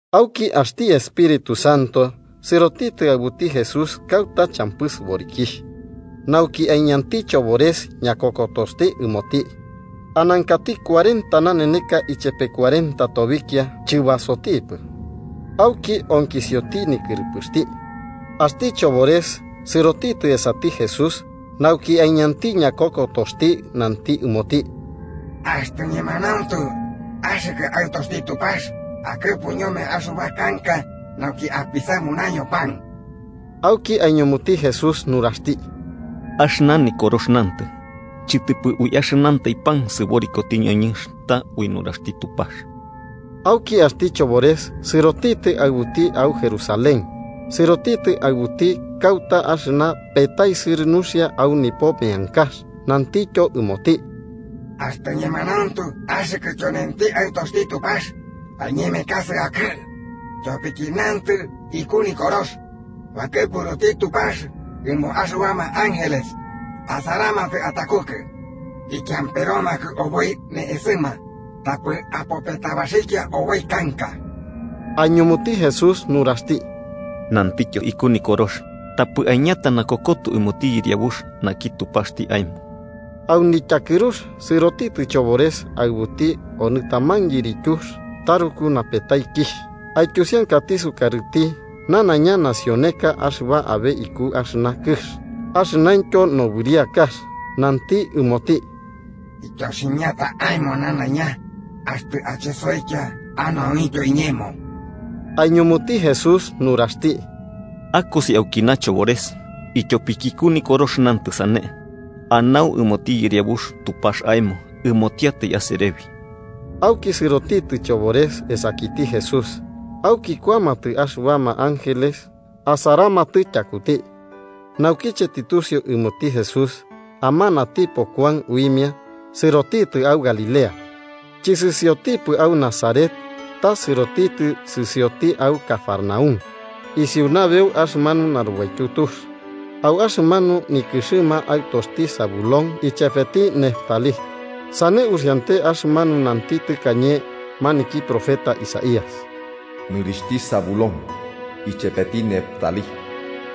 Auki axti Espíritu Santo sɨrotitɨ aɨbuti Jesús kauta champɨ sɨborikixh, nauki aiñanti chobores ñakokotoxti ɨmoti. Anankati cuarenta naneneka ichepe cuarenta tobikia chɨbasotipɨ, auki onkisioti nikɨrɨpɨxti. Axtɨ sɨrotitɨ chobores esati Jesús nauki aiñanti ñakokotoxti ɨmoti, nanti ɨmoti: –Axtɨ ñemanauntu axɨkɨ Aɨtoxti Tupax, akɨpu ñome axɨba kanka nauki apisamunaño pan. Auki aiñumuti Jesús nuraxti: –Axɨna Nikorox nantɨ: ‘Chɨtɨpɨ ui axɨnantai pan asɨboriti ñoñɨnx, ta ui nuraxti Tupax.’ Auki axti chobores sɨrotitɨ aɨbuti au Jerusalén, sɨrotitɨ aɨbuti kauta axɨna petaisɨrɨ nuxia au nipo meankax nantityo ɨmoti: –Axtɨ ñemanauntu axɨkɨ tyonenti Aɨtoxti Tupax, aiñemekasɨ akɨ'ɨ. Tyopiki nantɨ iku Nikorox: ‘Bakɨpuruti Tupax ɨmo axɨbama ángeles asaramatɨ atakukɨ. Ikiamperomakɨ oboi ne'esɨma, tapɨ apopetabaxikia oboi kanka.’ Aiñumuti Jesús nuraxti: –Nantityo iku Nikorox: ‘Tapɨ aiñata nakokoto ɨmoti Yɨriabux naki Tupaxti aemo.’ Au nityakɨrux sɨrotitɨ chobores aɨbuti onɨ taman yirityux taruku napetaikixh, aityusiankati sukarɨti nanaiña nacioneka axɨba abe iku axɨna kɨx axɨnaintyo nobɨriakax, nanti ɨmoti: –Ityoximiata aemo nanaiña, axtɨ achesoikia anau iñemo. Aiñumuti Jesús nuraxti: –Akosi aukina, Chobores, ityopiki iku Nikorox nantɨ sane: ‘Anau ɨmoti Yɨriabux Tupax aemo, ɨmotiatai aserebi.’ Auki sɨrotitɨ chobores esakiti Jesús, auki kuamatɨ axɨbama ángeles asaramatɨ tyakuti. Naukiche tɨtusiu ɨmoti Jesús amanatipo Kuan uimia, sɨrotitɨ au Galilea. Chɨsɨsiotipɨ au Nazaret, ta sɨrotitɨ sɨsioti au Cafarnaúm, isiu nabeu axɨmanu narubaityu tux, au axɨmanu nikɨxɨma aɨtoxti Zabulón ichepeti Neftalí. Sane uxiante axɨmanu nanti tɨkañe maniki profeta Isaías: “Nikɨxti Zabulón ichepeti Neftalí,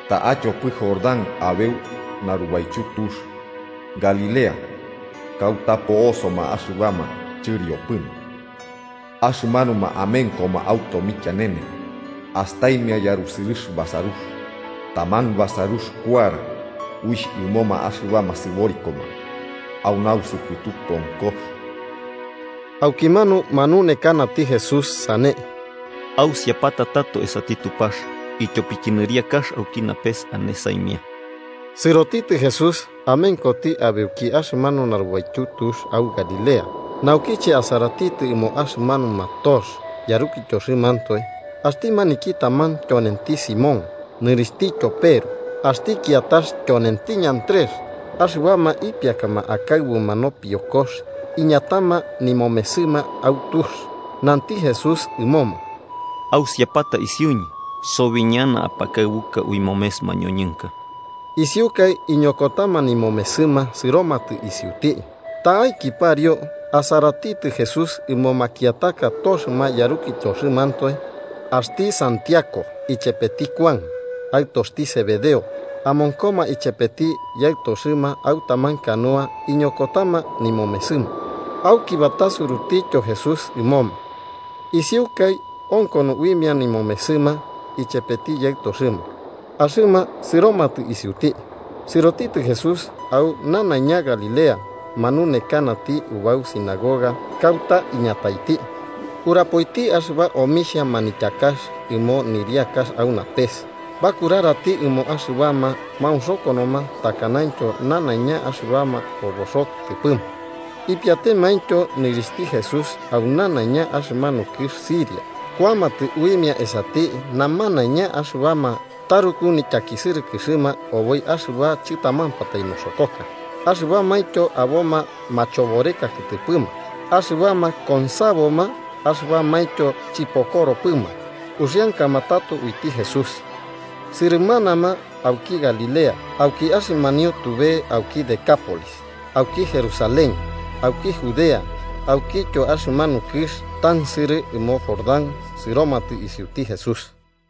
ta'a tyopɨ Jordán, abeu narubaityu tux: Galilea, kauta po'osoma axɨbama chɨriopɨma. Axɨmanuma amenkoma au tomikianene astaimia yarusɨrɨx basarux. Taman basarux kuara uixh ɨmo axɨbama sɨborikoma au nausɨpɨtu konkox.” Aukimanu manunekanati Jesús sane: “Ausiapata tato esati Tupax, ityopiki nɨriakax auki napes ane saimia.” Sɨrotitɨ Jesús amenkoti abeuki axɨmanu narubaityu tux au Galilea, naukiche asaratitɨ ɨmo axɨmanuma toxɨma yarukityoxɨmantoe: axti maniki taman tyonenti Simón, nɨrixhtityo Peru, axti kiatax tyonenti Andrés. Axɨbama ipiakama akaɨbuma nopiokox, iñatama nimomesɨma au tux. Nanti Jesús ɨmoma: –Ausiapata isiuñɨ, sobi ñana apakaɨbuka ui momes mañoñɨnka. Isiukai iñokotama nimomesɨma sɨromatɨ isiuti. Ta'aiki pariu, asaratitɨ Jesús ɨmo makiataka toxɨma yarukityoxɨmantoe: axti Santiago ichepeti Kuan, aɨtoxti Zebedeo, amonkoma ichepeti yaɨtoxɨma au taman canoa ikoñokotama nimomesɨma. Auki batasurutityo Jesús ɨmoma. Isiukai onkono uimia nimomesɨma ichepeti yaɨtoxɨma, axɨma sɨromatɨ isiuti. Sɨrotitɨ Jesús au nanaiña Galilea, manunekanati ubau sinagoga kauta iñataiti. Urapoiti axɨba omixhia manityakax ɨmo nɨriakax au napes bakurarati ɨmo axɨbama maunxokonoma takanaintyo nanaiña axɨba oboxo kɨtɨpɨma. Ipiatemaintyo nɨrixhti Jesús au nanaiña axɨmanu kɨx Siria, kuamatɨ uimia esati namanaiña axɨbama taruku nityakisɨrɨkɨxɨma oboi axɨba chɨtamampatai noxokoka, axɨbamaintyo aboma machoboreka kɨtɨpɨma, axɨbama konsaboma axɨbamaintyo chɨpokoropɨma. Uxiankama tato uiti Jesús. Sɨrɨmanama auki Galilea, auki axɨmanio tube auki Decápolis, auki Jerusalén, auki Judea aukityo axɨmanu kɨx tansɨrɨ ɨmo Jordán sɨromatɨ isiuti Jesús.